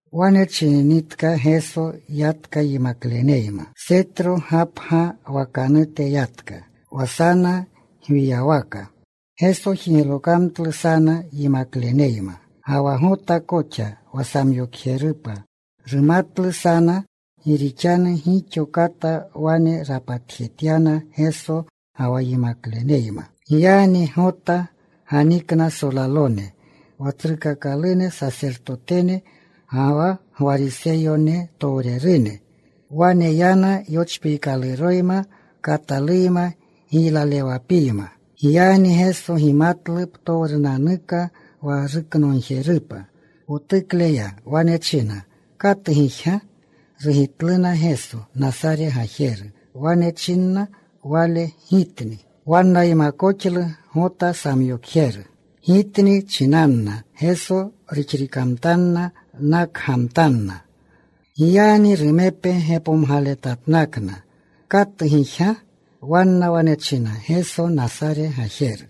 Wane chininitka Geso, yatka yimakleneyma. Setro Gapga wakanute yatka, wa sana gwiywaka. Geso jiglokamtlu sana yimakleneyma. Ga wa Gota koxa wa samyokjerupa rumatlu sana. Gi rixanu gixo kata wane rapatjetyana Geso ga wa yimakleneyma. Giyagni Gota ganikna solalone, wa tsrukakalune sasertotene ga wa Gwariseyonetowrerune. Wane yana yochpiikaluroyma, kataluyma, giylalewapiyma. Giyagni Geso gimatlu ptowrunanuka wa ruknogjerupa. Potukle ya. Wane chinna, “¿Katu gijga?” Rugitluna, “Geso, Nasare gajeru.” Wane chinna Wale, “Gitni.” Wannaymakoxlu Gota samyokjeru. “Gitni,” chinanna Geso, ruxririkamtanna. Nakgamtanna. Giyagni rumepe gepomgaletatnakna, “¿Katu gijga?” Wanna wane china, “Geso Nasare gajeru.”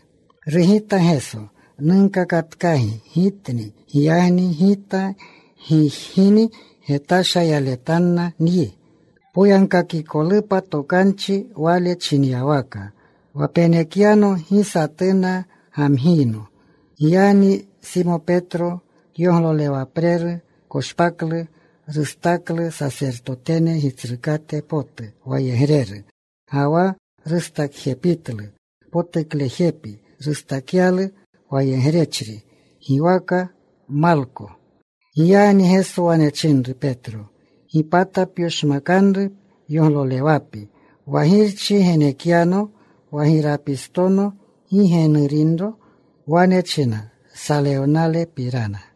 Rugita Geso, “Nunkakatkagi Gitni. Giyagni Gita gijgini getasha yaletanna nyi,” poyagkakikolupa tokanchi Wale chinyawaka, “Wa penekyano, gi satuna gamgiyno.” Giyagni Simo Petro kyoglolewapreru, koshpaklu. Rustaklu sasertotene gitsrukate potu wayegreru, ga wa rustakjepitlu. Potuklejepi rustakyalu. Wayegrechri giwaka Malko. Giyagni Geso wane chinru, “Petro, gipata pyoshmakanru yoglolewapi. Wa Girchi genekyano wa girapistono, ¿gi ge nurinro?” Wane china salewnalepapirana.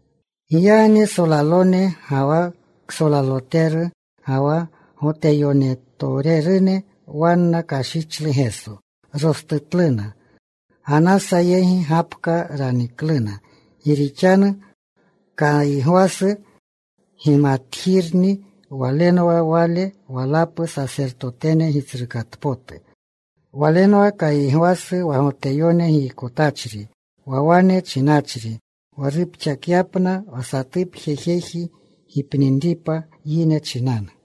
Giyagni solalone, ga wa ksolaloteru, ga wa Goteyonetowrerune, wanna kashichlu Geso. Rostutluna. Ganasa yegi gapka ranikluna. Gi rixanu Kaygwasu gimatjirni. Walenwa wale walapu sasertotene gitsrukatpotu. Walenwa Kaygwasu wa Goteyone giykotachri, wa wane chinachri wa rupxakyapna wa satu jeji gipninripa yine chinanu.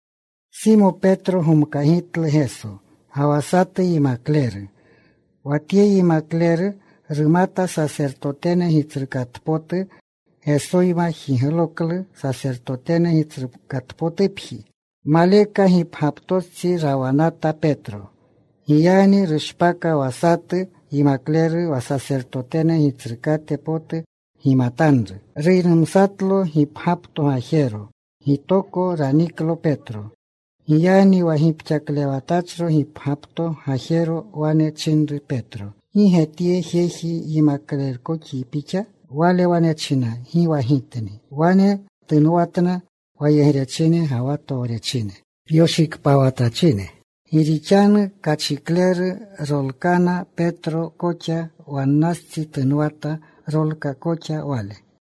Simo Petro gomkagitlu Geso, ga wa satu yimakleru. Wa tye yimakleru rumata sasertotene gitsrukatpotu. Gesoyma jigloklu sasertotene gitsrukatpotupji. Maleka, gipgyaptostsi rawanata Petro. Giyagni rushpaka wa satu yimakleru wa sasertotene gitsrukate potu gimatanru. Ruynumsatlo gipgyapto gajero. Gitoko raniklu Petro. Giyagni wa gipxaklewatachro gipgyapto gajero wane chinru Petro, “¿Gi ge tye jeji yimaklerkoxyi pixa?” Wale wane china, “Gi wa gitni.” Wane tunwanatna wayegrechine ga wa towrechine, yoshikpawatachine. Gi rixanu kachikleru. Rolkana. Petro koxa wannastsi tunwata. Rolka koxa wale.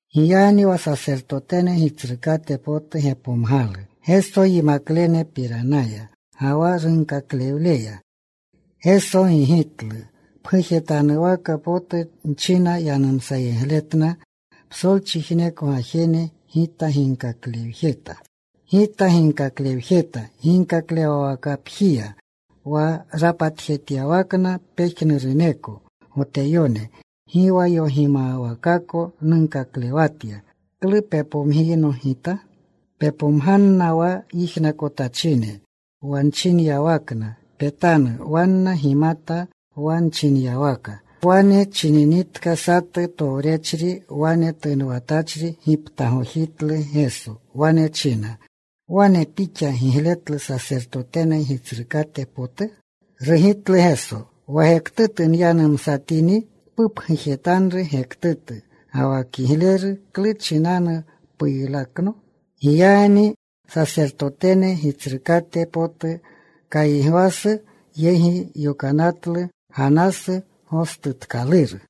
Giyagni wa sasertotene gitsrukate potu gepomgalu Geso, yimaklenepiranaya, ga wa runkaklewleya. Geso gigitlu, “Pgujetanuwaka potu nchina yanumsayegletna psolchijneko gajene. Gita ginkaklewjeta ginkaklewwakapjiya, wa rapatjejetyawakna pejnuruneko Goteyone. Gi wa yogimawakako nunkaklewatya. ¿Klu pepomgiyno Gita? Pepomganna wa yijnakotachine wa nchinyawakna. Petanu. Wanna gimata wa nchinyawaka.” Wa wane chininitka, satu towrechri wane tunwanatachri giptagojitlu Geso. Wane china, “¿Wane pixa gigletlu sasertotene gitsrukate potu?” Rugitlu Geso, “Wa gektutu nyanumsatini, pupgujetanru gektutu, ga wa kigleru, ¿klu chinanu puylakno?” Giyagni sasertotene gitsrukate potu Kaygwasu yegi yokanatlu Ganasu gostutkaluru.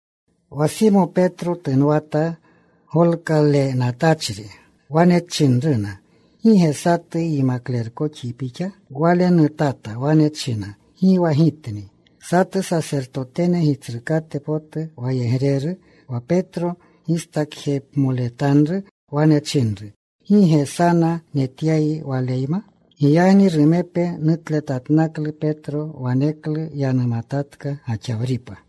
Wa Simo Petro tunwa golkalenatachri. Wane chinruna, “¿Gi ge satu yimaklerkoxyi pixa?” Wale nutata. Wane china, “Gi wa gitni.” Satu sasertotene gitsrukate potu wayegreru, wa Petro gistakjepmoletanru, wane chinru, “¿Gi ge sana netyayi Waleyma?” Giyagni rumepe nutletatnaklu Petro. Waneklu yanumatatka gaxawripa.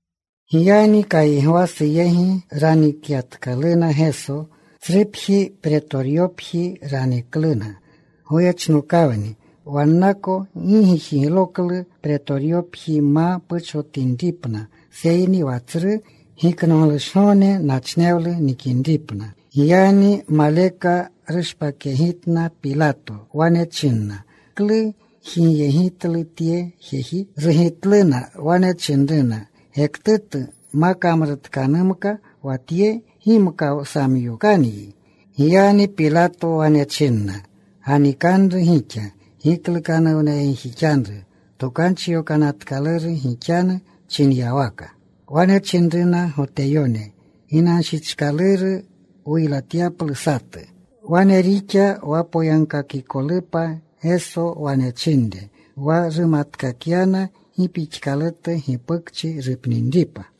Giyagni Kaygwasu yegi ranikyatkaluna Geso. Tsrupji, Pretoryopji ranikluna. Goyechnokawni. Wannako gi jigloklu Pretoryopji ma puchowninripna, seyni wa Tsru Giknoglushgogne nachnewlu nikinripna. Giyagni maleka rushpakyegitna Pilato. Wane china, “¿Klu gijigyegitlu tye jeji?” Rugitluna. Wane chinruna, “Gektutu ma kamrutkanumka wa Tye, gimka wsamyokanyi.” Giyagni Pilato wane chinna, “Ganikanru gixa. Giklukanuwnayegjixanru Tokanchi Yokanatkaluru gixanu chinyawaka.” Wane chinruna Goteyone, “Ginanshichkaluru wuylatyaplu satu.” Wane rixa wa poyagkakikolupa Geso wane chinre, wa rumatkakyana gi pixkalutu gipukchi rupninripa.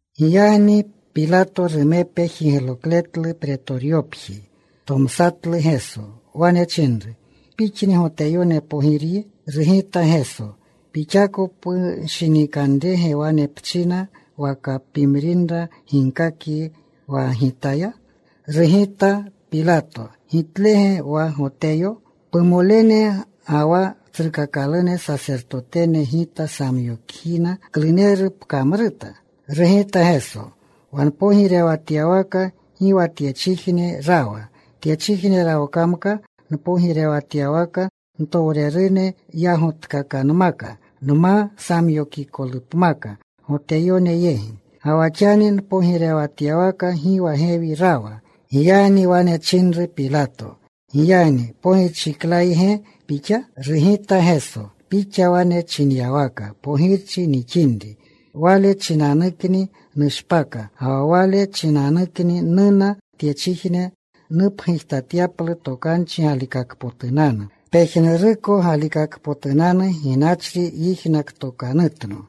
Giyagni Pilato rumepe jiglokletlu Pretoryopji. Tomsatlu Geso. Wane chinru, “¿Pixni Goteyone Pogiryi?” Rugita Geso, “¿Pixako pushinikanrerge wane pchina, waka pimrinra ginkakyi wa Gitaya?” Rugita Pilato, “¿Gitlege wa Goteyo? Pumolene ga wa tsrukakalune sasertotene gita samyokyina. ¿Kluneru pkamruta?” Rugita Geso, “Wa npogirewatyawaka gi wa tyechijne rawa. Tyechijne rawkamka npogirewatyawaka, ntowrerune yagotkakanmaka nma samyokikotupmaka Goteyone yegi. Ga wa xani npogirewatyawaka gi wa gewi rawa.” Giyagni wane chinru Pilato, “Giyagni ¿pogirchiklayge Pixa?” Rugita Geso, “Pixa wane chinyawaka pogirchi nixinri. Wale chinanukni nushpaka, ga wa wale chinanukni nuna tyechijne, nupgujtatyaplu tokanchi galikakpotunanu. Pejnuruko galikakpotunanu gixachri yijnaktokanutno.”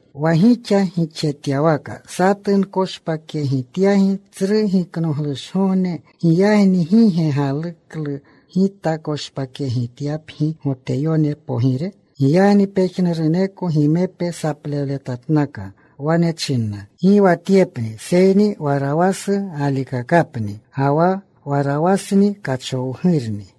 Wa gixa gixjetyawaka satu nkoshpakyegityagi tsru Giknoglushgogne. ¿Giyagni gi ge galuklu gita koshpakyegityapgi Goteyone Pogire?” Giyagni pejnuruneko gimepe saplewletatnaka. Wane chinna, “Gi wa Tyepni, seyni Warawasu galikakapni.” Ga wa Warawasni kachowgurni.